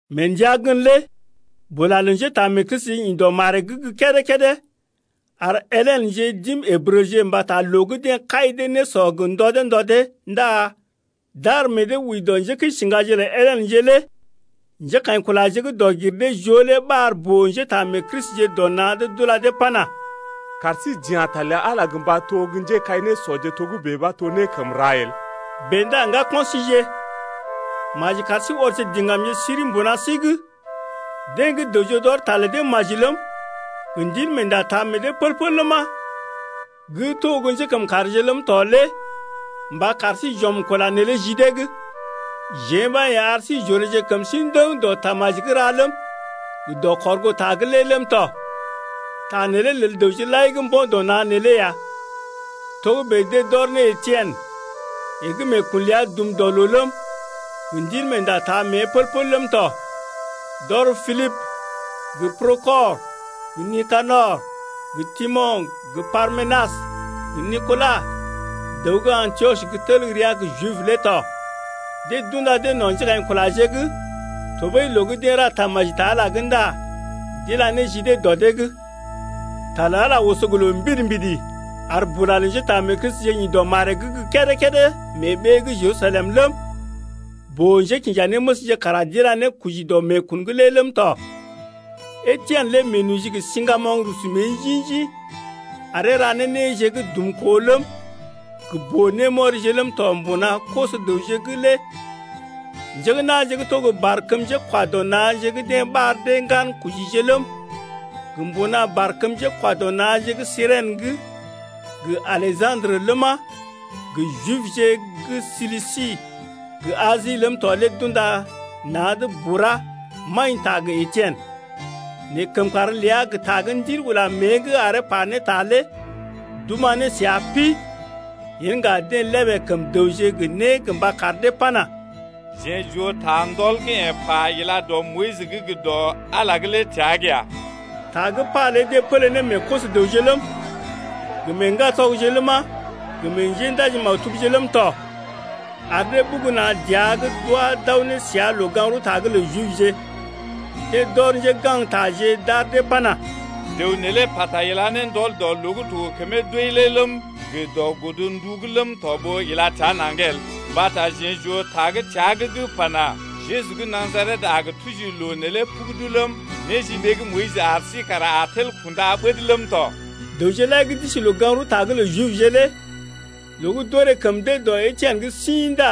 Mee ndəa gən lé bula lə njétaamee-Kristije ḭ dɔ maree’g gə́ kédé-kédé ar Helenje d’im Ǝbrəje mbata loo gə́ deḛ kai dee nésɔ gə ndɔ dee ndɔ dee ndá d’ar meḛ dee wəi dɔ njékəisiŋgaje’g lə Helenje lé. Njékaḭkulaje gə́ dɔg-gir-dee-joo lé ɓar boo-njétaamee-Kristije dɔ na̰’d d’ula dee pana: Kar sí j’ya̰ ta lə Ala gə mba to gə́ njékai-nésɔje togə́bè ɓa to né gə́ kəm ra el. Bèe ndá ŋgako̰ síje, maji kar sí ɔrje diŋgamje siri mbuna sí’g, deḛ gə́ dəwje d’ɔr ta lə dee maji ləm, gə́ Ndilmeenda taa meḛ dee pəl-pəl ləma, gə́ to gə́ njékəmkàrje ləm tɔ lé mba kar sí j’ɔm kula neelé ji dee’g. Jeḛ ɓa yḛ̀ ar sí j’oreeje kəm sí ndəŋ dɔ tamaji gə́ ra ləm, gə dɔ kɔrgoota gə́ lé ləm tɔ. Ta neelé lel dəwje lai gə́ mbo̰ dɔ na̰ neelé ya. Togə́bè deḛ d’ɔr ne Etien, yeḛ gə́ meekun ləa dum dɔ loo ləm, gə Ndilmeenda taa mée pəl-pəl ləm tɔ. D’ɔr Pilibə gə Prokɔr gə Nikanɔr gə Timo̰ gə Parmenas gə Nikola, dəw gə́ Antiɔs gə́ tel rəa gə́ Jib lé tɔ. Deḛ d’unda dee no̰ njékaḭkulaje’g tɔɓəi loo gə́ deḛ ra tamaji ta Ala’g lé ndá d’ila ne ji dee dɔ dee’g. Ta lə Ala lé oso gə loo mbidi-mbidi ar bula lə njétaamee-Kristije ḭ dɔ maree’g gə́ kédé-kédé mee ɓee gə́ Jerusalem ləm, boo-njékinjanéməsje kara d’ila ne koji dɔ meekun’g lé ləm tɔ. Etien lé meenoji gə siŋgamoŋ rusu mée njḭ-njḭ aree ra ne néje gə́ dumkoo ləm, gə boo-némɔrije ləm tɔ mbuna koso-dəwje’g lé. Njé gə́ na̰je gə́ to barkəm njékwa dɔ na̰je gə́ deḛ ɓar dee Ŋgankojije ləm, gə mbuna barkəm njékwa dɔ na̰je gə́ Sirèn’g gə Aleja̰drə ləma, gə Jibje gə́ Silisi gə Asi ləm tɔ lé d’unda na̰’d bura maḭta gə Etien. Nɛ kəmkàr ləa gə ta gə́ Ndil ula mée’g aree pa ne ta lé d’oma̰ ne səa pi. Yen ŋga deḛ lébè kəm dəwje gə né gə mba kar dee pana: Jeḛ j’oo ta ndɔl gə́ yeḛ pa ila dɔ Moyis’g gə dɔ Ala’g lé təa’g ya. Ta gə́ pa lé deḛ pələ ne meḛ koso-dəwje ləm, gə meḛ ŋgatɔgje ləma, gə meḛ njéndaji-maktubje ləm tɔ, ar dee ɓugu na̰ dəa’g d’wá d’aw ne səa loo-gaŋg-rəwta’g lə Jibje. Deḛ d’ɔr njégaŋgtaje d’ar dee pana: Dəw neelé pata ila ne ndɔl dɔ loo gə́ to gə kəmee doi lé ləm gə dɔ godndu’g ləm tɔ ɓó ila təa naŋg el, mbata jeḛ j’oo ta gə́ təa’g gə́ pana: Jeju gə́ Najaret a gə tuji loo neelé pugudu ləm, néjiɓee gə́ Moyis ar sí kara a tel kunda ɓəd ləm tɔ. Dəwje lai gə́ d’isi loo-gaŋg-rəwta’g lə Jibje lé loo gə́ d’orè kəm dee dɔ Etien’g sḭ ndá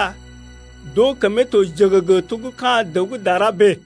d’oo kəmee to jəgəgə to gə́ ka̰ dəw gə́ dara bèe.